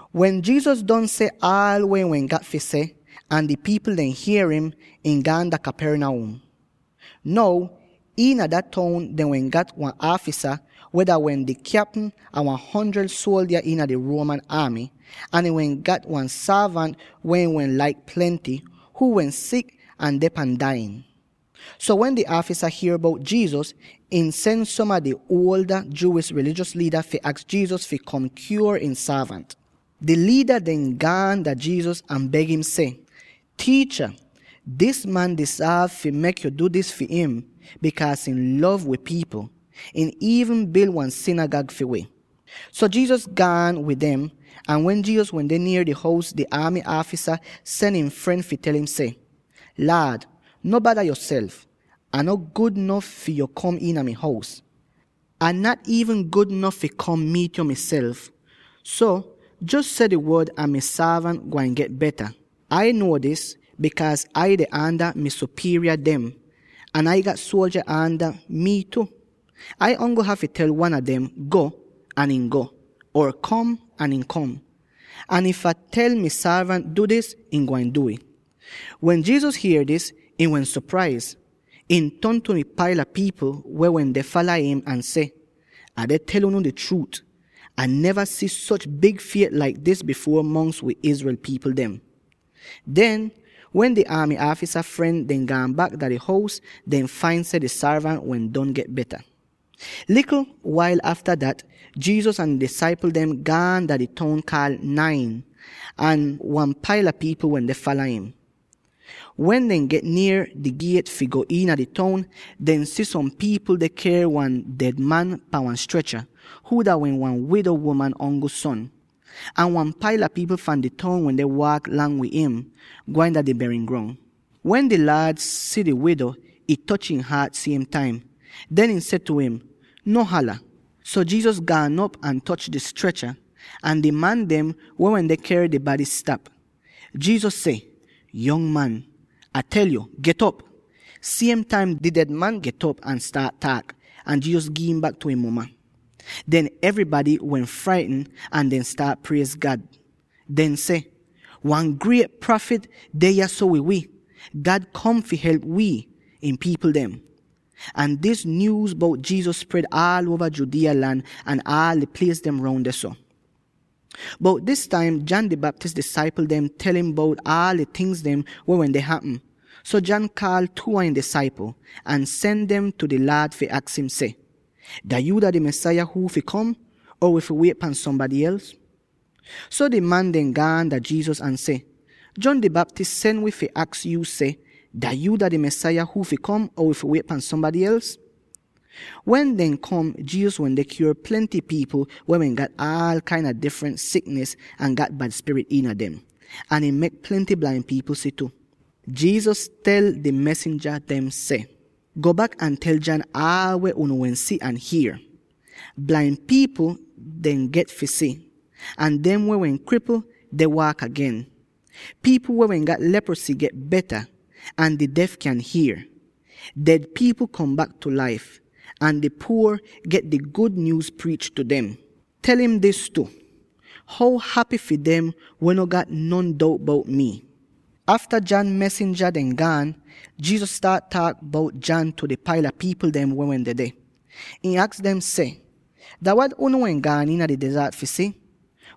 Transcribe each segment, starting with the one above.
Wen Jesus don seh aal weh ihn wehn gat fi seh, ahn di pipl dem hier im, ihn gaan dah Capernaum. Now, iina dah toun dehn wehn gat wan aafisa —weh dah wehn di kyapm a wan hundred suoldya iina di Roman aamy— ahn ihn wehn gat wan sorvant, weh ihn wehn laik plenty, huu wehn sik ahn deh pan dai'in. So wen dis aafisa hier bout Jesus, ihn sen som a di ada Jewish rilijos liida fi aks Jesus fi kom kyuor ihn sorvant. Di liida dem gaan dah Jesus ahn beg im seh, “Tiicha, dis man dizorv fi mek yo du dis fi im, bikaaz ihn lov wi pipl. Ihn iivn bil wan sinigag fi wi.” So Jesus gaan wid dem, ahn wen Jesus wende nier di hous, di aamy aafisa sen ihn fren fi tel im seh, “Laad, no bada yoself; Ah no gud nof fi yo kom iina mi hous. Ah nat iivn gud nof fi kom miit yo miself. So, jos seh di wod ahn mi sorvant gwain get beta. Ai nuo dis, bikaaz Ai deh aanda mi sopierya dem, ahn Ai gat suoldya aanda mii tu. Ai ongl hafy tel wan a dem, ‘Go!’ ahn ihn go, or ‘Kom!’ ahn ihn kom. Ahn if Ah tel mi sorvant, ‘Du dis!’ ihn gwain du'ih.” Wen Jesus hier dis, ihn wehn sopraiz; ihn ton tu di paila pipl weh wende fala im ahn seh, “Ah deh tel unu di chruut: Ah neva si soch big fiet laik dis bifuor mongs wi Israel pipl dem.” Den, wen di aamy aafisa fren dem gaan bak dah di hous, dehn fain seh di sorvant wehn don get beta! Likl wail afta dat, Jesus ahn ihn disaipl dem gaan dah di toun kaal Nain, ahn wan paila pipl wende fala im. Wen dehn get nier di giet fi go iina di toun, dehn si som pipl deh ker wan ded man pan wan strecha, huu dah wehn wan wido uman ongl son. Ahn wan paila pipl fahn di toun wende waak lang wid im, gwain dah di berin grong. Ahn wen di Laad si di wido, ih toch ihn haat siem taim. Den ihn seh tu im, “No hala.” So, Jesus gaan op ahn toch di strecha, ahn di man dem weh wende ker di bady stap. Jesus seh, “Yong man, Ah tel yo, get'op!” Siem taim di ded man get'op ahn staat taak; ahn Jesus gi'im bak tu ihn muma! Den evrybady wehn fraitn ahn dehn staat priez God. Dehn seh, “Wan griet prafit deh yahso wid wi! God kom fi help wii, ihn pipl dem!” Ahn dis nyuuz bout Jesus spred aal uova Judea lan ahn aal di plies dem roun dehso. Bout dis taim, John di Baptist disaipl dem tel im bout aal di tingz weh wende hapm, so John kaal two a ihn disaipl, ahn sen dem tu di Laad fi aks im seh, “Dah yuu dah di Mesaya huu fi kom, or wi fi wiet pahn sombady els?” So di man dem gaan dah Jesus ahn seh, “John di Baptist sen wi fi aks yuu seh, ‘Dah yuu dah di Mesaya huu fi kom, or wi fi wiet pahn sombady els?’” Wen dehn kom, Jesus wende kyuor plenty pipl weh wehn gat aal kain a difrent siknis ahn gat bad spirit iina dem; ahn ihn mek plenty blain pipl si tu. Jesus tel di mesinja dem seh, “Go bak ahn tel John aal weh unu wehn si ahn hier: blain pipl dehn get fi si, ahn dem weh wehn kripl deh waak agen; pipl weh wehn gat leprosy get beta, ahn di def kyan hier. Ded pipl kom bak tu laif, ahn di puor pipl dem get di gud nyuuz priich tu dem. Tel im dis tu: How hapy fi dem weh no gat non dout bout mii.” Afta John mesinja dem gaan, Jesus staat taak bout John tu di paila pipl weh wehn dedeh; ihn aks dem seh, “Dah wat unu wehn gaan iina di dezart fi si?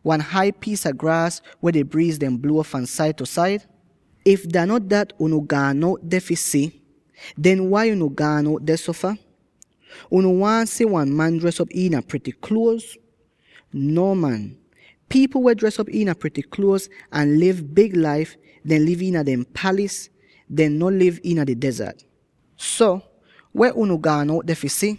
Wan hai piis a graas weh di briiz deh bluo fahn said tu said? If dah no dat unu gaan out deh fi si, den wai unu gaan out dehso fah? Unu waahn si wan man dres op iina prity kluoz? Nuo man; pipl weh dres op iina prity kluoz ahn liv big laif, dehn liv iina dehn palis; dehn no liv iina di dezart. So, weh unu gaan out deh fi si?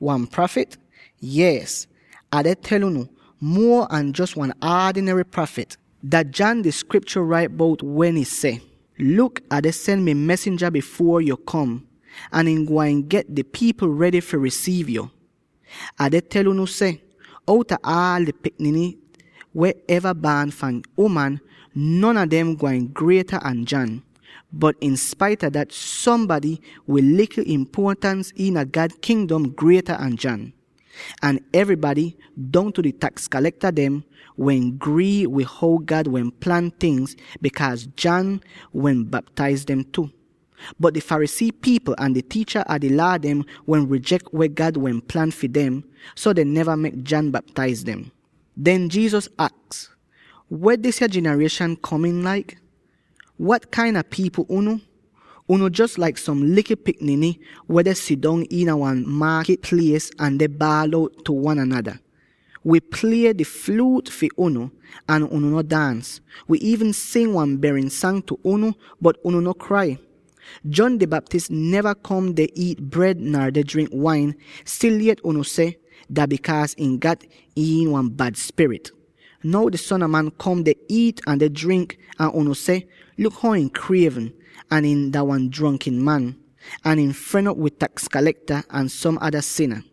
Wan prafit? Yees, ahn Ah deh tel unu, muo an jos wan aadinary prafit. Dah John di Skriptyo rait bout weh ih seh: ‘Luk, Ah deh sen mi mesinja bifuor yu kom, ahn ihn gwain get di pipl redy fi risiiv yu.’ Ah deh tel unu seh: outa aal di pikniny weh eva baan fahn uman, non a dem gwain grieta an John. Bot inspaita dat, sombady wid likl impuotans iina God Kingdom grieta an John.” Ahn evrybady —dongtu di taks kalekta dem— wehn grii wid how God wehn plan tingz, bikaaz John wehn baptaiz dem tu. Bot di Pharisee pipl ahn di tiicha a di Laa dem wehn rijek weh God wehn plan fi dem, so dehn neva mek John baptaiz dem. Den Jesus aks, “Weh disya jinarieshan kom'in laik? Wat kain a pipl unu? Unu jos laik som likl pikniny weh deh sidong iina wan maakit plies ahn deh baal out tu wan anada: ‘Wi plie di fluut fi unu, ahn unu no daans; wi iivn sing wan berin sang tu unu, bot unu no krai!’ John di Baptist neva kom deh iit bred nar deh drink wain, stil yet unu seh, ‘Dah bikaaz ihn gat iin wan bad spirit.’ Now di Son a Man kom deh iit ahn drink, ahn unu seh, ‘Luk how ihn krievn, ahn ihn dah wan jronkin man; ahn ihn fren op wid taks kalekta ahn som ada sina.’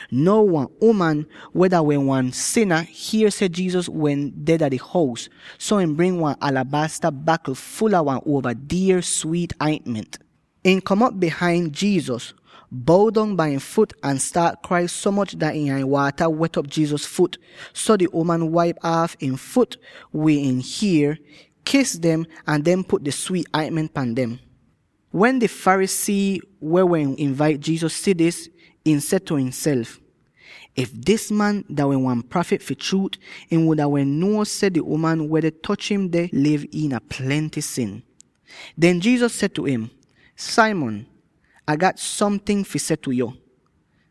Now wan uman, weh dah wehn wan sina, hier seh Jesus wehn deh dah di hous, so ihn bring wan alabasta bakl ful a wan uova dier swiit aintment. Ihn kom op bihain Jesus, bow dong bai ihn fut, ahn staat krai so moch dat ihn ai-waata wet'op Jesus fut. So di uman waip aaf ihn fut wid ihn hier, kis dem, ahn den put di swiit aintment pan dem. Wen di Pharisee weh wehn invait Jesus si dis, ihn seh tu imself, “If dis man dah wehn wan prafit fi chruut, ihn wuda wehn nuo seh di uman weh deh toch im deh liv iina plenty sin!” Den Jesus seh tu im, “Simon, Ah gat somting fi seh tu yo.”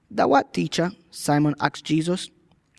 “Dah wat, tiicha?” Simon aks Jesus.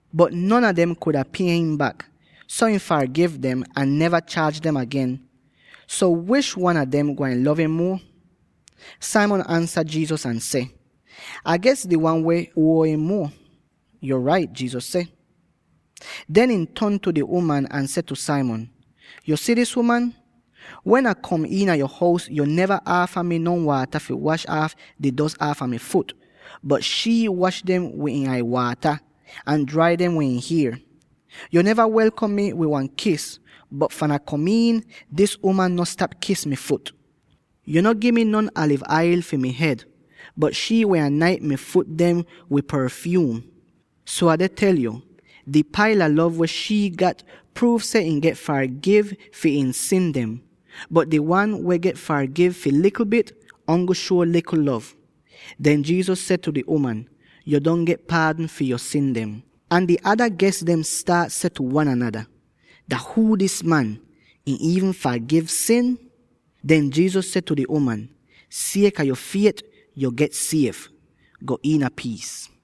Bot non a dem kudn pie im bak, so ihn fargiv dem, ahn neva chaaj dem agen. So, wish wan a dem gwain lov im muo?” Simon ansa Jesus ahn seh, “Ah ges di wan weh wehn huo im muo.” “Yo rait,” Jesus seh. Den ihn ton tu di uman ahn seh tu Simon, “Yo si dis uman? Wen Ah kom iina yo hous, yo neva aafa mi non waata fi wash aaf di dos aafa mi fut, bot shii wash dem wid ihn ai-waata, ahn drai dem wid ihn hier. Yo neva welkom mi wid wan kis, bot fahn Ah kom iin, dis uman no stap kis mi fut. Yo no gi mi non aliv ail fi mi hed, bot shii wehn anaint mi fut dem wid porfyuum. So Ah deh tel yo: di paila lov weh shii gat pruuv seh ihn get fargiv fi ihn sin dem. Bot di wan weh wehn get fargiv fi likl bit, ongl shuo likl lov.” Den Jesus seh tu di uman, “Yo don get paadn fi yo sin dem.” Ahn di ada ges dem staat seh tu wan anada, “Dah huu dis man; ihn iivn fargiv sin?” Den Jesus seh tu di uman, “Sieka yo fiet, yo get siev. Go iina piis.”